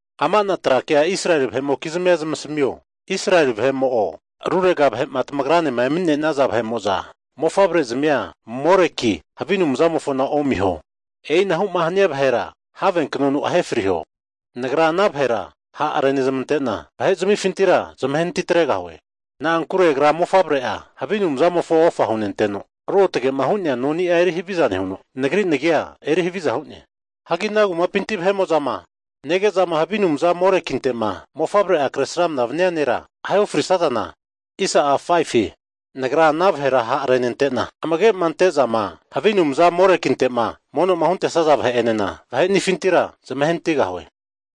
Ama'na trakea Israeli vahe'mokizmia zamasimio, Israeli vahe'mo'o rurega vahe'ma tamagranema emani'nesaza vahe'mo'za, mofavrezmia Moreki havi anumzamofona omiho. E'inahuma hania vahera have knonu ahefriho. Nagra ana vahera ha'renezmante'na, vahe zmifintira zamavare atregahue. Na'ankure agra mofavre'a havi anumzamofo ofa hunenteno ruotage'ma hu'nea noni'a eri haviza nehuno, Nagri nagi eri haviza hu'ne. Hagi ana kumapinti vahe'mo'zama nege'zama havi anumzama Morekinte'ma mofavre'a kresramna vania nera ahe ofrisazana, Nagra ana vahera ha'renente'na amage'ma ante'zama havi anumza Morekinte'ma mono'ma huntesaza vahe'enena vaheni'afintira zamahenatigahue.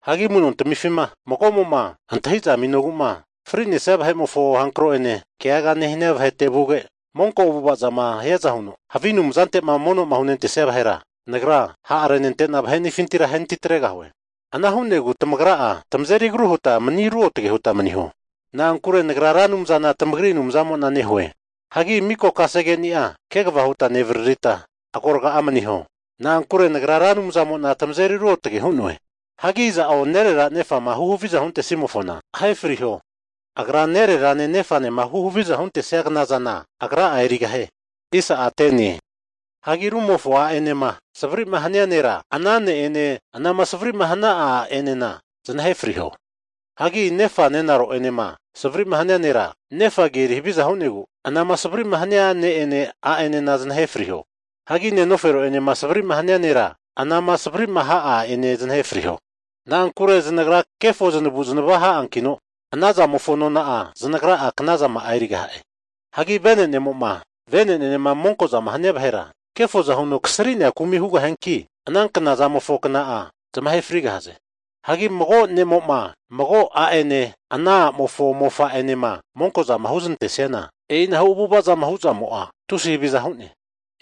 Hagi amu'notamifintima mago'mo'ma antahiza aminogu'ma fri'nesia vahe'mofo hankro ene keagaga nehania vahete vuge, monko avu'avazama hiaza huno havi anumzante mono'ma hunentesia vahera, Nagra ha'arente'na vahe'niafintira ahenati atregahue. Anahu'negu tamagra'a tamazeri agru huta mani ruotage huta maniho, na'ankure Nagra Ra Anumzana tamagri Anumzamo'na nehue. Hagi miko kase keni'a kegava huta nevaririta, agoraga'a maniho, na'ankure Nagra Ra Anumzamo'na tamazeri ruotagera hu'noe. Hagi iza'o nerera nefama huhavizama huntesimofona ahefriho. Agra nererane nefanema huhavizama huntesia knazana agra'a erigahie. Hagi rumofo a'enema savri'ma hania nera, ana ne'ene anama savri'ma hania a'enena zanahe friho. Hagi nefa nenaro enema savrima hania nera, nefa agi eri haviza hu'negu, anama savrima hania ne'ene a'ene zanahe friho. Hagi nenofero enema savri'ma hania nera, anama savri'ma hana'a a'ene zanahe friho. Na'ankure zanagra kefo zanavu'zanava ha'ankino anazamofo nona'a zanagra'a knazama'a erigaha'e. Hagi venenemo'ma venenenema monkozama hania vahera, kefoza huno kasri'nea kumi hugaha'anki, ana knazamofo kna'a zamahe frigahaze. Hagi mago ne'mo'ma mago a'ene ana a'mofo mofa anema monkozama huzanantesiana, e'inahu avu'ava'ma hu'zamo'a tusi haviza hu'ne.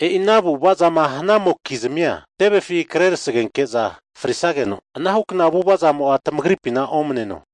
E'i ana avu'ava'ma hanamokizmia tevefi kre tasegenke'za frisageno anahukna avu'avazamo'a tamagripina omaneno.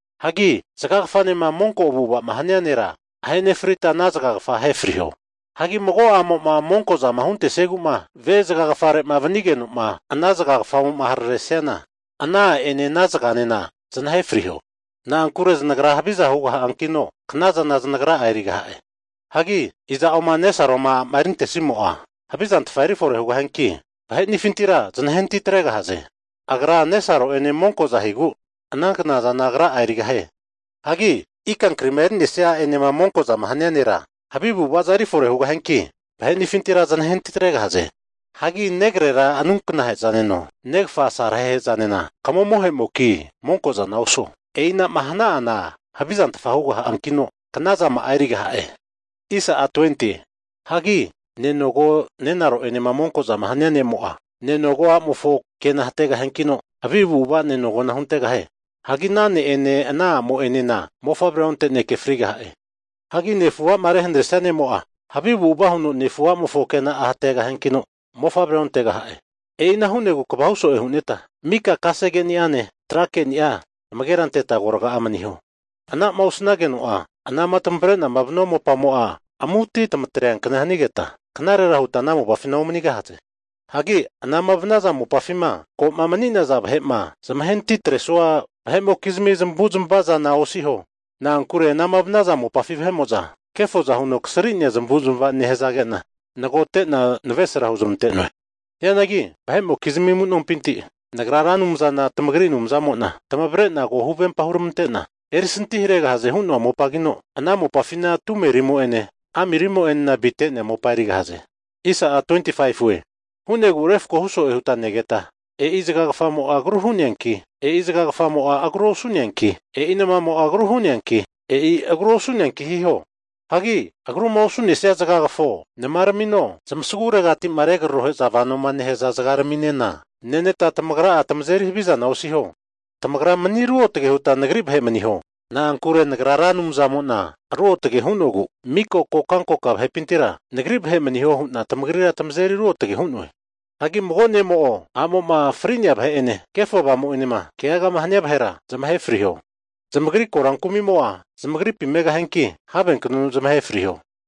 Hagi zagagafanema monko avu'ava'ma hania nera, ahe nefrita ana zagagafa ahefriho. Hagi mago a'mo'ma monko'zama huntesiegu'ma, ve zagafarema vanigeno'ma ana zagagafamo'ma hararesiana, ana a'ene ana zaganena zanahe friho. Na'ankure zanagra haviza hugaha'ankino knazana zanagra 'a erigaha'e. Hagi iza'o nesaroma a'ma erintesimo'a, havizantfa erifore hugaha'anki, vahenifintira znahe anati atregahaze. Agra nesaro'ene monkoza higu, ana knazana agra'a erigahie. Hagi ikankrima eri'nesia a'enema monko'zama hania nera, havi avu'avaza erifore hugahiankino, vahenifintira zanahenati atregahaze. Hagi negrera anunkna'hezaneno, negafa asarahehezanena kamomohe'moki, monkozana osuo. E'inama hana'ana havizantfa hugahiankino knazama'a erigaha'e. Hagi nenogo nenaro'enema monkozama hania ne'mo'a, nenogo a'mofo kena'a hategahiankino, havi avu'ava nenogona huntegahie. Hagi ana ne'ene ana a'mo'enena mofavrea onte'neke frigaha'e. Hagi nefu a'ma rehanaresia ne'mo'a, havi avu'ava huno nefu a'mofo kena'a hategahiankino mofavre ontegaha'e. E'ina hu'negu kva hu so'e huneta, miko kasegeni'ane tra keni'a amagera anteta agorga'a maniho. Ana'ma osanageno'a anama tamavre'na vanua mopamo'a amu'ati tamatreankna hanigeta knarera huta ana mopafina omanigahaze. Hagi anama vanaza mopafima ko'ma mani'naza vahe'ma zamahenati atresua vahe'mokizmi zamavu'zamava zana osiho. Na'ankure anama vanaza mopafi vahe'mo'za kefoza huno kasri'nea zamavu'zamava nehazage'na nagote'na navesra huzmante'noe. Hianagi vahe'mokizmi amu'nompinti Nagra Ra Anumzana tamagri Anumzamo'na tamavre'na ko huvempa hurmante'na erisanti haregahaze hu'noa mopagino, ana mopafina tumerimo'ene amirimo'a avite'nea mopa erigahaze. E'ina hu'negu refkohu so'e huta negeta, e'i zagagafamo'a agru hu'neanki, e'i zagagafamo'a agru osu'neanki, e'i namamo'a agru hu'neanki, e'i agru osu'neanki hiho. Hagi agruma osu'nesia zagagafo, namaramino, zmasaguregati'ma regrorohe'za vanoma nehaza zagaraminena, neneta tamagra'a tamazeri havizana osiho. Tamagra mani ruotage huta Nagri vahe maniho, na'ankure Nagra Ra Anumzamo'na ruotage hu'nogu miko kokankoka vahepintira Nagri vahe maniho hu'na tamagrira tamazeri ruotage hu'noe. Hagi mago ne'mo'o a'mo'ma fri'nea vahe'eneno kefo avamu'enema keagama hania vahera zamahe friho. Zamagri korankumimo'a zamagripi megahianki havenknonu zamahe friho.